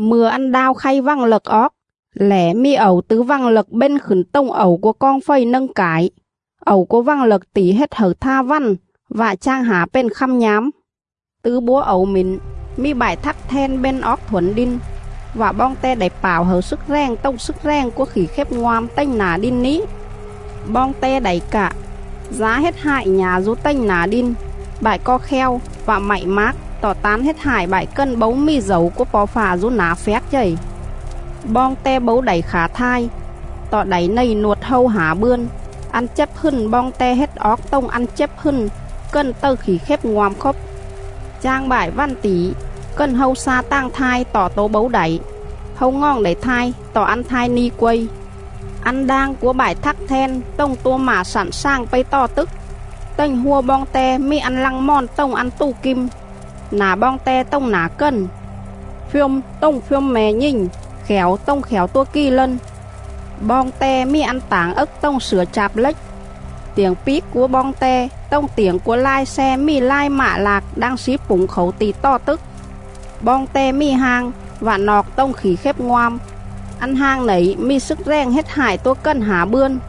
Mư̱a ăn đao khay vằng lậc oóc lẻ mì ẩu tứ vằng lậc bên khửn tồng ẩu cúa coong fầy nâng cải; ẩu cúa vằng lậc tỉ hết hẩư tha vằn vạ chang hả pền khăm nhám.. Tứ búa ẩu mỉn mì bại thắc then bên oóc thuổn đin, vạ boong te đảy pảo hẩư slức rèng tồng slức rèng cúa khỉ khếp ngoam tềnh nả đin ní.. Boong te đảy cạ, dá hết hại nhả dú tềnh nả đin, bại co kheo vạ mạy mác tọ tán hết hại bại cần bấu mì dẩu cúa Po̱ Fạ dú nả phjác chầy.. Boong te bấu đảy khả thai, tọ đảy nầy nuột hâu hả bươn. Ăn chếp hừn boong te hết oóc tồng ăn chếp hừn cần tầư khỉ khếp ngoam khốp. Chang bại vằn tỉ, cần hâu xa tàng thai tọ tố bấu đảy; hâu ngoòng đảy thai tọ ăn thai ni quây.. Ăn đang cúa bại thắc then tồng tua mạ slặn slàng pây tò tức. Tềnh hua boong te mì ăn lăng mòn tồng ăn tù kim; nả boong te tồng nả cần;. phjôm tồng phjôm me̱ nhình; khẻo tồng khẻo tua kì lân.. Boong te mì ăn tảng ấc tồng slửa chạp lếch; tiểng píc cúa boong te tồng tiểng cúa lai xe mì lai mạ lạc đang slí pủng khảu ti̱ tò tức.. Boong te mì hang vạ nọc tồng khỉ khếp ngoam; ăn hang nẩy mì slức rèng hết hại tua cần hả bươn.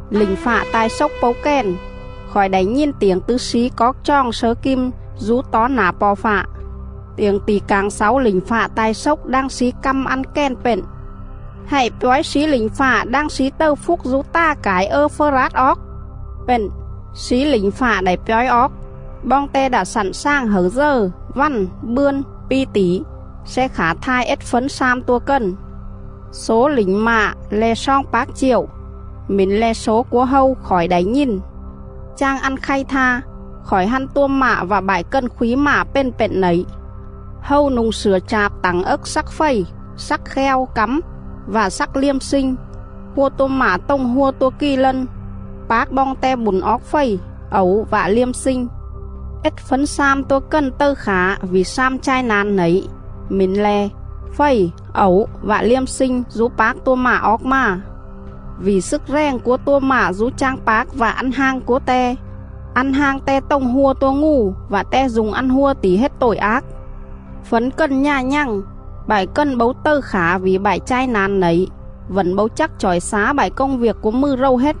Lỉnh fạ ta̱i xốc pấu kèn, khỏi đảy nhìn tiểng tứ slí coóc choòng slớ kim dú tó nả Po̱ Fạ.. Tiểng tỉ cảng xáu lỉnh fạ ta̱i xốc đang slí căm ăn kèn pện: “Hạy pjói slí lỉnh fạ đang slí tầư phúc dú ta̱ cải Ơ-phơ-rát oóc.” Pện, slí lỉnh fạ đảy pjói oóc; boong te đạ slặn slàng hẩư dờ, vằn, bươn, pi tỉ sle khả thai ết fấn slam tua cần. Slố lỉnh mạ le̱ sloong pác chiệu. Mỉn le̱ slố cúa hâu khỏi đảy nhìn. Chang ăn khay tha, khỏi hăn tua mạ vạ bại cần khúy mạ pền pện nẩy: Hâu nu̱ng slửa chạp tảng ấc slắc fầy, slắc kheo cắm vạ slắc liêm slinh; hua tua mạ tồng hua tua kì lân; pác boong te bủn oóc fầy, ẩu vạ liêm slinh. Ết fấn slam tua cần tầư khả vỉ slam chai na̱n nẩy, mỉn le̱: fầy, ẩu vạ liêm slinh dú pác tua mạ oóc mà. Vỉ slức rèng cúa tua mạ dú chang pác vạ ăn hang cúa te; ăn hang te tồng hua tua ngù vạ te du̱ng ăn hua tỉ hết tội ác. Fấn cần nhà nhằng, bại cần bấu tầư khả vỉ bại chai na̱n nẩy, vẩn bấu chắc chỏi xá bại công viêc cúa mừ rầu hết,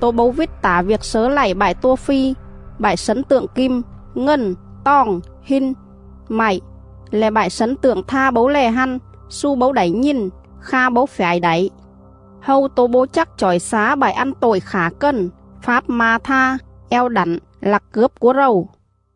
tố bấu vít tả viêc slớ lạy bại tua phi, bại slấn tượng kim, ngần, toòng, hin, mạy le̱ bại slấn tượng tha bấu lè hăn, xu bấu đảy nhìn, kha bấu phjải đảy.. Hâu tố bấu chắc chỏi xá bại ăn tội khả cần, fáp ma̱ tha, eo đẳn, lặc cướp cúa rầu.